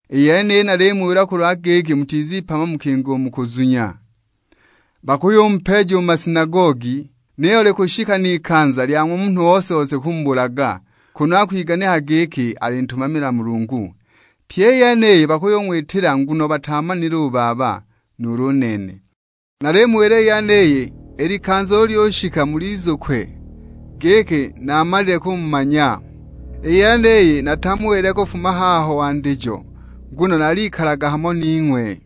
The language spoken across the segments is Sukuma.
"I yeniyi nalimuwila kulwa giki mutizipama mukinga u mu kuzunya. Bakuyumupeeja u mu masinagogi; niyo likushika n'ikanza lya ng'wa munhu ose-ose kumubulaga, kunu akwiganikaga giki alintumamila Mulungu. Pyi i yeniyi bakung'witila nguno bataamanile u Baba, nuulu u nene. Nalimuwila i yeniyi, i likanza ulu lyushika mulizukwe, giki naamalile kumumanya." "I yeniyi natamuwilile kufuma haho wandijo nguno naalikalaga hamo ning'we.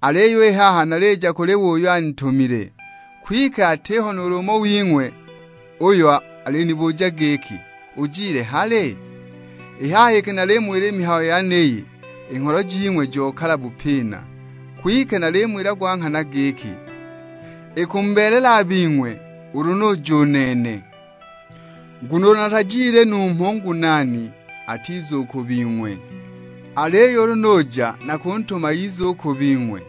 Aliyo i haha nalija kuli we uyo anitumile, kwike atiho nuulu umo wing'we uyo alinibuja giki, 'Ujile hali?' I haha iki namuwila i mihayo yeniyi, i ngholo jing'we jokala bupina. Kwike nalimuwila gwa nghana giki, ikumubeelela a bing'we ulu nuja u nene; nguno ulu natajile numho u Ngunaani atiza u ku bing'we; aliyo ulu nuja nakuntuma ize u ku bing'we.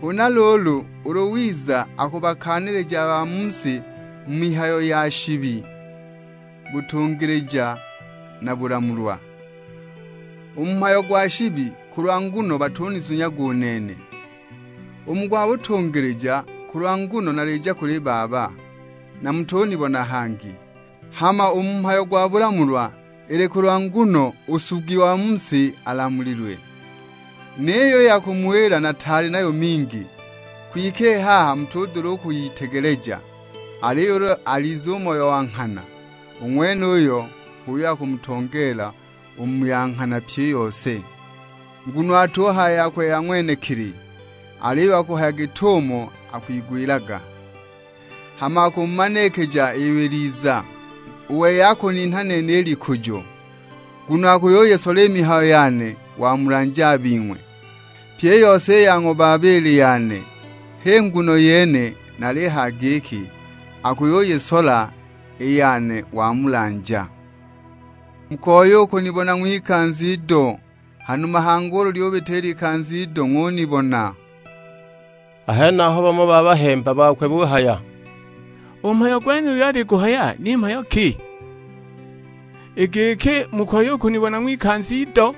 Huna luulu, ulu wiza akubakaanilija a ba mu si mu mihayo ya: shibi, butungilija na bulamulwa. U mu mhayo gwa shibi, kulwa nguno batunizunyaga u nene. U mu gwa butungilija, kulwa nguno nalija kuli Baba, na mutunibona hangi. Hama u mu mhayo gwa bulamulwa, ili kulwa nguno u nsugi wa mu si alamulilwe. Niyo i ya kumuwila nataali nayo mingi, kwike i haha mutudula u kwiyitegeleja. Aliyo ulu alize u Moyo wa nghana, u ng'wenuyo h'uyo akumutongeela u mu ya nghana pyi i yose. Nguno atuhaya yakwe ya ng'wenekili, aliyo akuhaya git'umo akwigwilaga; hama akumumanikija iyo iliza. U wei akuninha nene i likujo, nguno akuyuyisola i mihayo yane wamulanja a bing'we. Pyi i yose i ya ng'wa Baba ili yane; h'i nguno yene nalihaya giki akuyuyisola i yane wamulanja." "Mukoya u kunibona ng'wikanza ido, hanuma hangi ulu lyubita ikanza ido ng'unibona." A henaho bamo ba bahemba bakwe buhaya, "U mhayo gwenuyu aliguhaya, ni mhayo ki? I giki, 'Mukoya u kunibona ng'wikanza ido?'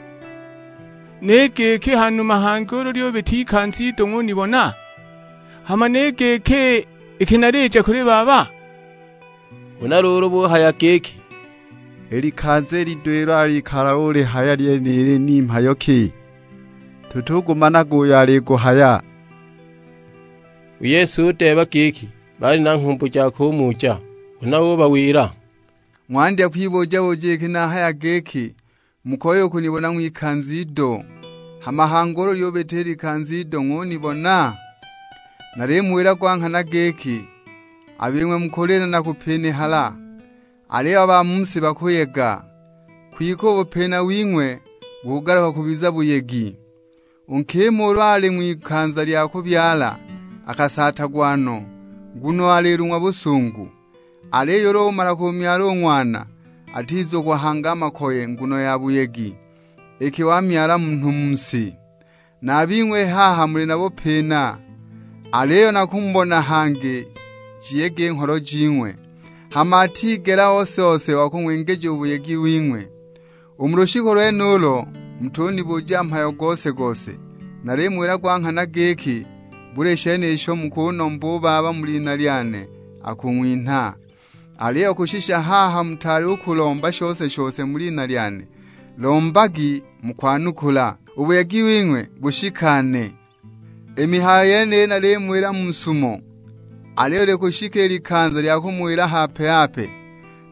Ni giki, 'Hanuma hangi ulu lyubita ikanza ido ng'unibona?' Hama ni giki, 'Iki nalija kuli Baba?' " Huna luulu buhaya giki, "I likanza i lido ilo alikala ulihaya lyenili, ni mhayo ki? Tutugumanaga uyo aliguhaya!" U Yesu udeeba giki baali na nghumbu ja kumuja; huna ubawila, "Ng'wandya kwibuja-buja iki nahaya giki, 'Mukoya u kunibona ng'wikanza ido, hama hangi ulu lyubita ikanza ido ng'unibona?' Nalimuwila gwa nghana giki, a bing'we mukulila na kupinihala, aliyo a ba mu si bakuyega. Kwike u bupina wing'we bukugaluka kubiza buyegi. U nkima ulu ali ng'wikanza lya kubyala akasaatagwa no, nguno alilung'wa busungu; aliyo ulu umala kumyala u ng'wana, atugizukwa hangi a makoye nguno ya buyegi, iki wamyala munhu mu si. Na a bing'we i haha muli na bupina; aliyo nakumubona hangi jiyege i ngholo jing'we. Hama atigela ose-ose wa kung'wingija u buyegi wing'we. U mu lushiku lwenulo, mutunibuja mhayo gose-gose. Nalimuwila gwa nghana giki buli shene isho mukunomba u Baba mu lina lyane akung'winha. Aliyo kushisha haha mutaali u kulomba shose-shose mu lina lyane; lombagi mukwanukula, u buyegi wing'we bushikane." "I mihayo yeniyi nalimuwila mu sumo; aliyo likushika i likanza lya kumuwila hape-hape;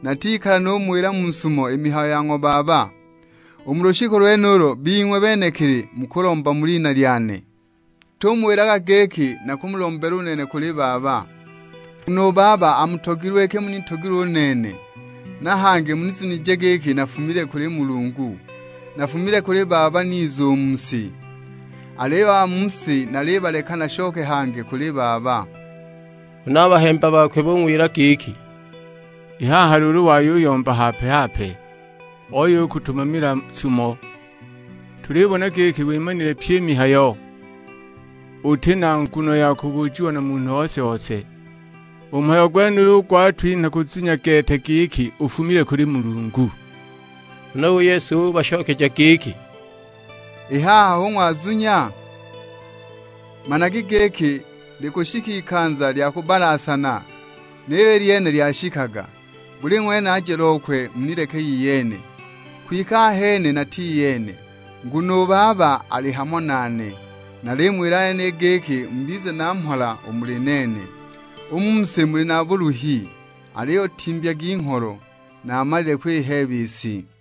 natikala numuwila mu sumo i mihayo ya ng'wa Baba. U mu lushiku lwenulo bing'we benekili mukulomba mu lina lyane, natumuwilaga giki nakumulombela nene u kuli Baba. Nguno u Baba amutogilwe iki munitogilwe u nene, na hangi muzunije giki nafumile kuli Mulungu. Nafumile kuli Baba niza u mu si; aliyo a ba mu si nalibaleka nashoke hangi kuli Baba." Huna a bahemba bakwe bung'wila giki, "I haha luulu wayuyomba hape-hape, oya u kutumamila sumo. Tulibona giki wimanile pyi i mihayo, uti na nguno ya kubujiwa na munhu ose-ose; u mhayo gwenuyo gwatwinha kuzunya gete giki ufumile kuli Mulungu." Huna u Yesu ubashokeja giki, "I haha hu ng'wazunya? Managi giki likushika ikanza lya kubbalasana, niyo i lyene lyashikaga: buli ng'wene aje lokwe munileke iyene, kwike ahene nati iyene, nguno u Baba ali hamo nane. Nalimuwila i yeniyi giki mubize na mhola u muli nene; u mu si muli na buluhi, aliyo timbyagi ngholo, naamalile kwiheeba i si."